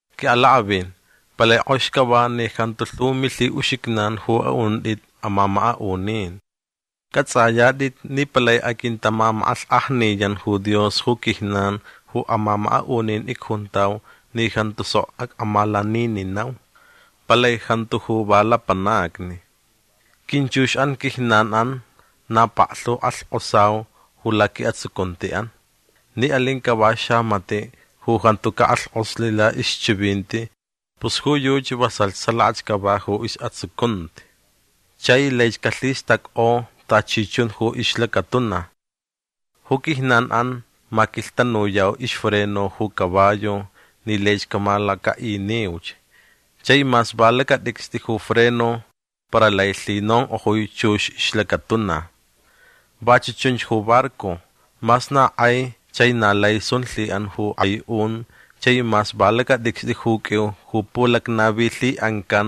Qui'alak'avin palai k'ox cava ni jantu lhu milhi'uxijnan ju a'unt'it amamaka'unin. C'ats'ayat'it ni palai aquintamamak'alhk'ajniyan ju Dios ju quijnan ju amamaka'unin icjuntau ni jantu sok ac'amalanininau. Palai jantu ju va lapanacni. Quinchux'an quijnan'an na paklhu ju k'alhk'osau ju laqui'atsucunti'an. Ni alin cava xamati' ju jantu cak'alhk'oslh la'ixchivinti pus ju yuchi vasalh salakach cava ju is'atsucunti. Chai laich calhistack'o tachi chun ju ixlacatuna. Ju quijnan'an maquilhtanuyau ixfreno ju caballo ni laich camalaca'iniuch. Chai mas va lacat'icst'i ju freno para lai lhinonk'ojui chux ixlacatuna. Vachu' chunch ju barco. Mas na k'ai chai na lai sun lhi'an ju k'ai un chai mas va lacat'icst'i ju q'uiu ju pulacnavilhi'ancan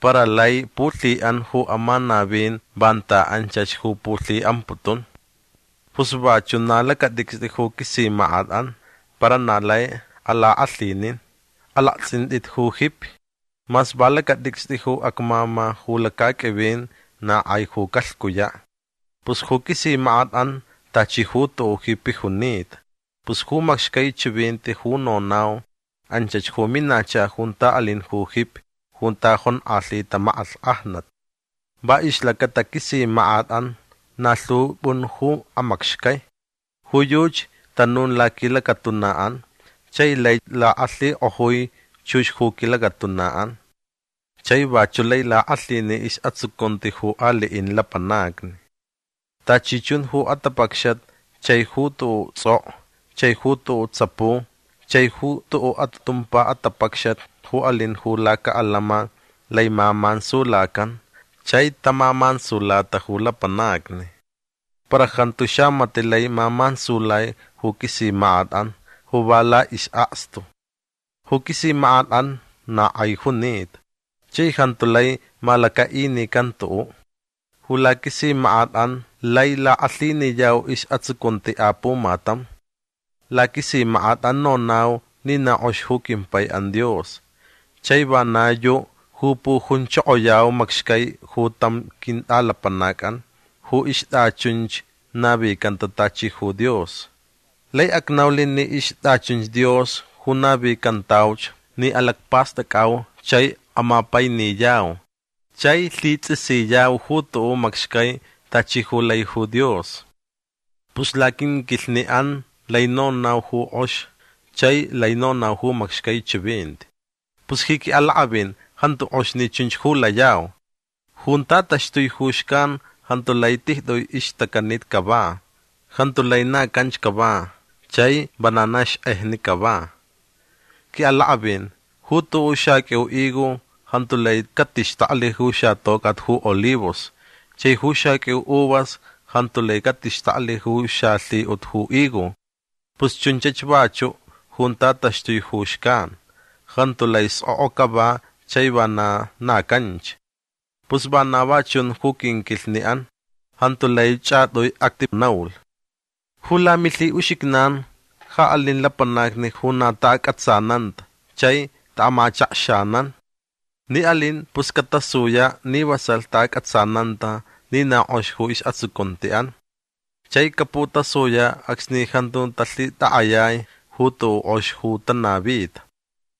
para lai pulhi'an ju amanavin vanta anchach ju pulhi'amputun. Pus vachu' na lacat'icst'i ju quisimak'at'an para na lai alak'alhinin. Alakts'int'it ju jipi. Mas va lacat'icst'i ju acmama ju lacaq'uivin na k'ai ju calhcuya'. Pus ju quisimak'at'an tachi ju tu'u' jipi junita. Pus ju macxcai chivinti ju nonau anchach ju minacha junta alin ju jipi junta jonk'alhita mak'alhk'ajnat. Va ixlacata quisimak'at'an na lhu p'un ju amacxcai. Ju yuchi tanun laquilacatuna'an chai lai lak'alhik'ojui chux ju quilacatuna'an. Chai vachu' lai lak'alhini is'atsucunti ju ali'in lapanacni. Tachi chun ju atapacxat chai ju tu'u' ts'ok'o chai ju tu'u' tsapu chai ju tu'u' atumpa atapacxat ju alin ju laca'alama lai mamansulacan chai tamamansulata ju lapanacni. Para jantu xamati' lai mamansulai ju quisimak'at'an ju va la'is'akstu. Ju quisimak'at'an na k'ai junita. Chai jantu lai malaca'inican tu'u'. Ju laquisimak'at'an lai lak'alhiniyau is'atsucunti apumatam. Laquisimak'at'an nonau ni na k'ox ju quimpai'an Dios. Chai vana yu' ju pujunchokoyau macxcai ju tam quint'alapanac'an ju ixt'achunch navicanta tachi ju Dios. Lai acnaulh ni ixt'achunch Dios ju navicantauch ni alacpast'ac'au chai amapainiyau chai lhits'isiyau ju tu'u' macxcai tachi ju lai ju Dios. Pus laquinquilhni'an lai nonau ju k'ox chai lai nonau ju macxcai chivinti. Pus ji qui'alak'avin jantu k'ox ni chunch ju layau. Junta taxtui ju xcan jantu lai tijt'ui ixtacanit cava. Jantu lai na canch cava chai vana na xk'ejni cava. Qui'alak'avin ju tu'u' xaq'uiu higo jantu lai catixtaklh ju xatoc'at ju olivos. Chai ju xaq'uiu uvas jantu lai catixtaklh ju xalhi'ut ju higo. Pus chunchach vachu' junta taxtui ju xcan. Jantu lai sk'ok'o cava chai vana na canch. Pus vana va chun ju quinquilhni'an. Jantu lai ch'at'ui atinaulh. Ju lamilhi'uxijnan ja alin lapanacni ju na ta'ac'atsananta chai ta'amachakxanan. Ni alin pus catasuya' ni vasalh ta'ac'atsananta ni na k'ox ju is'atsucunti'an. Chai caputasuya' acsni jantu talhitak'ayai ju tu'u' k'ox ju tanavita.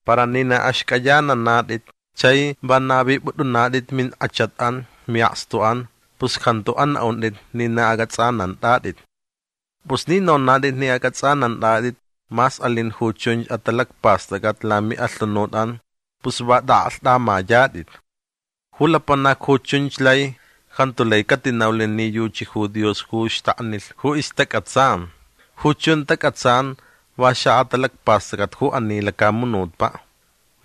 Para ni na axc'ayananat'it chai va navip'ut'unat'it mink'achat'an mi'akstu'an pus jantu ana'unt'it ni na ac'ats'anant'at'it. Pus ni nonat'it ni ac'ats'anant'at'it mas alin ju chunch atalacpast'ac'at lami'alhunut'an pus va t'a'aklht'amayat'it. Ju lapanac ju chunch lai jantu lai catinaulh ni yuchi ju Dios ju xtaknilh ju istac'atsan. Ju chun tac'atsan va xa'atalacpast'ac'at ju ani lacamunutpa'.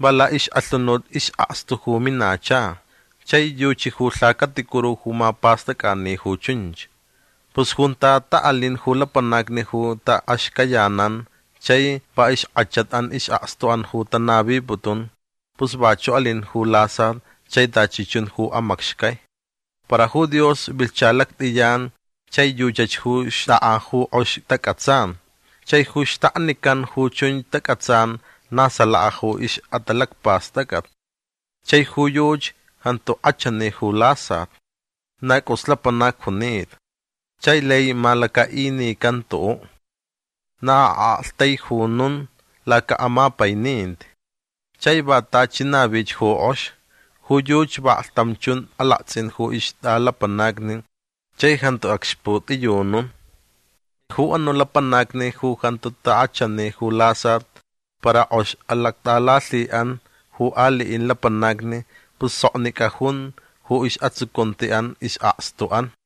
Va la'ix'alhunut is'akstu ju minacha. Chai yuchi ju lhacaticuru ju mapast'ac'ani ju chunch. Pus junta ta'alin ju lapanacni ju ta'axcayanan chai va ixk'achat'an is'akstu'an ju tanaviputun pus vachu' alin ju lasat chai tachi chun ju amacxcai. Para ju Dios vilhcha lact'iyan chai yuchach ju xt'ak'a ju k'ox tac'atsan. Chai ju xtaknican ju chunch tac'atsan na salaka ju ix'atalacpast'ac'at. Chai ju yuchi jantu k'achani ju lasat. Na c'us lapanac junita. Chai lai malaca'inican tu'u'. Na a'aktaijunun laca'amapaininti. Chai va tachi navich ju k'ox. Ju yuchi vaklhtam chun alakts'in ju ixt'alapanacni chai jantu acxput'iyunun. Chai ju anu' lapanacni ju jantu tak'achani ju lasat para k'ox alact'alalhi'an ju ali'in lapanacni pus soknic'a jun ju is'atsucunti'an is'akstu'an.